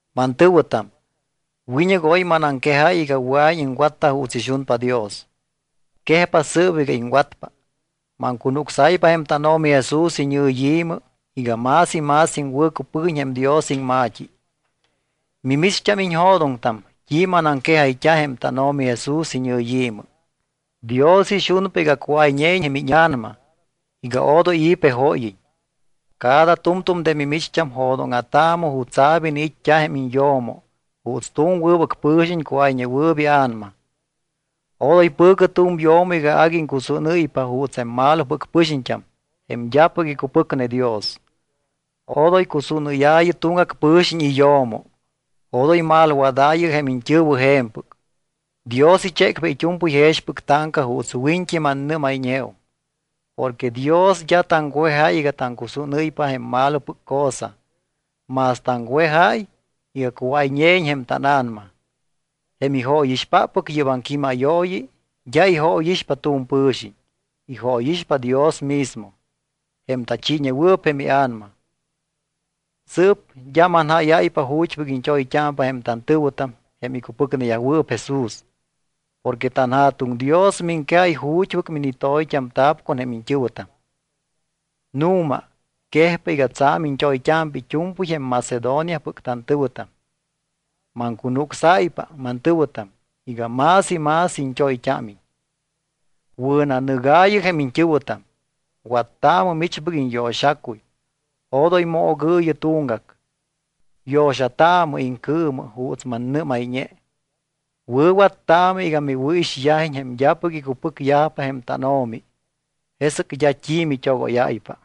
Mantɨ̱wɨtam, wiñɨc oy manaŋquejáy iga wɨa̱iñ iŋwatta juuts ixunpa Dios. Quejpa sɨɨp iga iŋwatpa. Maŋcunucsáypa jém tánO̱mi Jesús iñɨyi̱mɨ iga más y más iŋwɨ̱cupɨguiñ jém Dios iŋma̱t́i. Mimicht́am iñjo̱doŋtam t́i manaŋquejayt́a jém tánO̱mi Jesús iñɨyi̱mɨ. Dios ixunpa iga cuáyñeiñ jém íña̱nama, iga odoy i̱ pejóyiñ. Cada tu̱mtu̱m de mimicht́am jo̱dóŋa̱taamɨ jutsa̱p iniit́t́a jém iñyo̱mo juuts tu̱m wɨbɨc pɨ̱xiñ cuáyñewɨɨp ia̱nama. Odoy pɨ̱cɨ tu̱m yo̱mo iga agui iŋcusúnɨ́ypa juuts jém malopɨc pɨxiñt́am jém d́apɨc icupɨcne Dios. Odoy cusúnɨ́yaayɨ tuŋgac pɨ̱xiñ iyo̱mo, odoy malwadaayɨ jém iñt́ɨ̱wɨ je̱mpɨc. Dios ichécpa it́u̱mpɨy jexpɨc táŋca juuts wiñt́i mannɨ́mayñeum. Porque Dios d́a taŋwejáy iga taŋcusúnɨ́ypa jém malopɨc cosa, más taŋwejáy iga cuáyñeiñ jém tána̱nama. Jém ijóyixpaap yɨ́p aŋquímayooyi d́a ijóyixpa tu̱m pɨ̱xiñ, ijóyixpa Dios mismo, jém tachiiñewɨɨp jém iA̱nama. Sɨɨp d́a manjáyáypa ju̱t́pɨc iñt́oyt́ámpa jém tantɨ̱wɨtam jém icupɨcneyajwɨɨp Jesús. Porque tanJa̱tuŋ Dios miŋquejáy ju̱t́pɨc minitoyt́amta̱p con jém iñt́ɨ̱wɨtam. Nu̱ma, quejpa iga tsa̱m iñt́oyt́ámpa it́u̱mpɨy jém Macedoniapɨc tantɨ̱wɨtam. Maŋcunucsáypa mantɨ̱wɨtam iga más y más iñt́oyt́ámiñ. Wɨ̱nanɨgaayɨ jém iñt́ɨ̱wɨtam, wattaamɨ michpɨc iñyo̱xacuy, odoy moogɨɨyɨ tuŋgac. Yo̱xataamɨ iŋcɨɨmɨ juuts mannɨ́mayñe. Wɨ̱wattaamɨ iga miwɨ̱ixyajiñ jém d́apɨc icupɨcyajpa jém tánO̱mi. Jesɨc d́a t́i mit́ogóyáypa.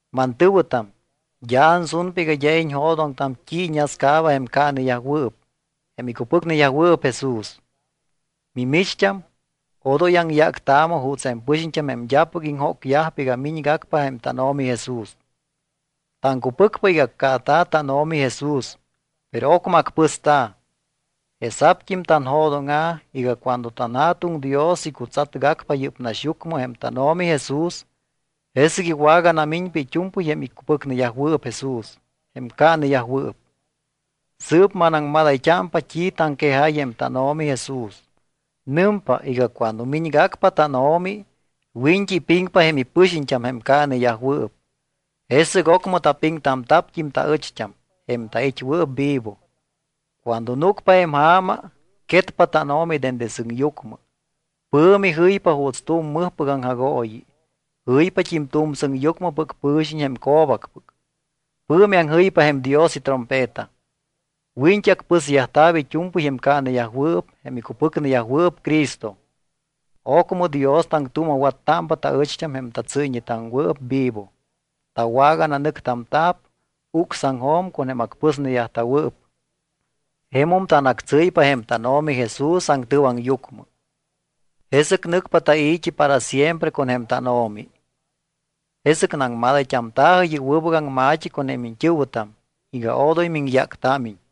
Mantɨ̱wɨtam, d́a ansunpa iga d́a iñjo̱doŋtam t́i iñascaaba jém caaneyajwɨɨp, jém icupɨcneyajwɨɨp Jesús. Mimicht́am, odoy aŋyáctaamɨ juuts jém pɨxiñt́am jém d́apɨc iŋjócyajpa iga miñgacpa jém tánO̱mi Jesús. Taŋcupɨcpa iga accaata̱ tánO̱mi Jesús, pero ocmɨ acpɨsta̱. Jesa̱pt́im tanjo̱dóŋa̱ iga cuando tanJa̱tuŋ Dios icutsatgacpa yɨ́p naxyucmɨ jém tánO̱mi Jesús, jesɨc iwaganamiñpa it́u̱mpɨy jém icupɨcneyajwɨɨp Jesús, jém caaneyajwɨɨp. Sɨɨp manaŋmadayt́ámpa t́i taŋquejáy jém tánO̱mi Jesús. Nɨmpa iga cuando miñgacpa tánO̱mi, wiñt́i ipiŋpa jém ipɨxiñt́am jém caaneyajwɨɨp. Jesɨc ocmɨ tapiŋtamta̱pt́im taɨcht́am, jém tait́wɨɨp vivo. Cuando núcpa jém ja̱ma, quetpa tánO̱mi dende sɨŋyucmɨ, pɨ̱mi jɨypa juuts tu̱m mɨjpɨc aŋjagooyi. Jɨypat́im tu̱m sɨŋyucmɨpɨc pɨ̱xiñ jém co̱bacpɨc. Pɨ̱mi aŋjɨypa jém Dios itrompeta. Wiñt́i acpɨsyajta̱p it́u̱mpɨy jém caaneyajwɨɨp jém icupɨcneyajwɨɨp Cristo. Ocmɨ Dios taŋtuuma̱wattámpa taɨcht́am, jém tatsɨ́yñetaŋwɨɨp vivo. Tawagananɨctamta̱p ucsaŋjo̱m con jém acpɨsneyajta̱wɨɨp. Jemum tanactsɨ́ypa jém tánO̱mi Jesús aŋtɨwaŋyucmɨ. Jesɨc nɨcpa tai̱t́i para siempre con jém tánO̱mi. Jesɨc naŋmadayt́amta̱jɨ yɨ́p wɨbɨc aŋma̱t́i con jém iñt́ɨ̱wɨtam iga odoy miŋyáctámiñ.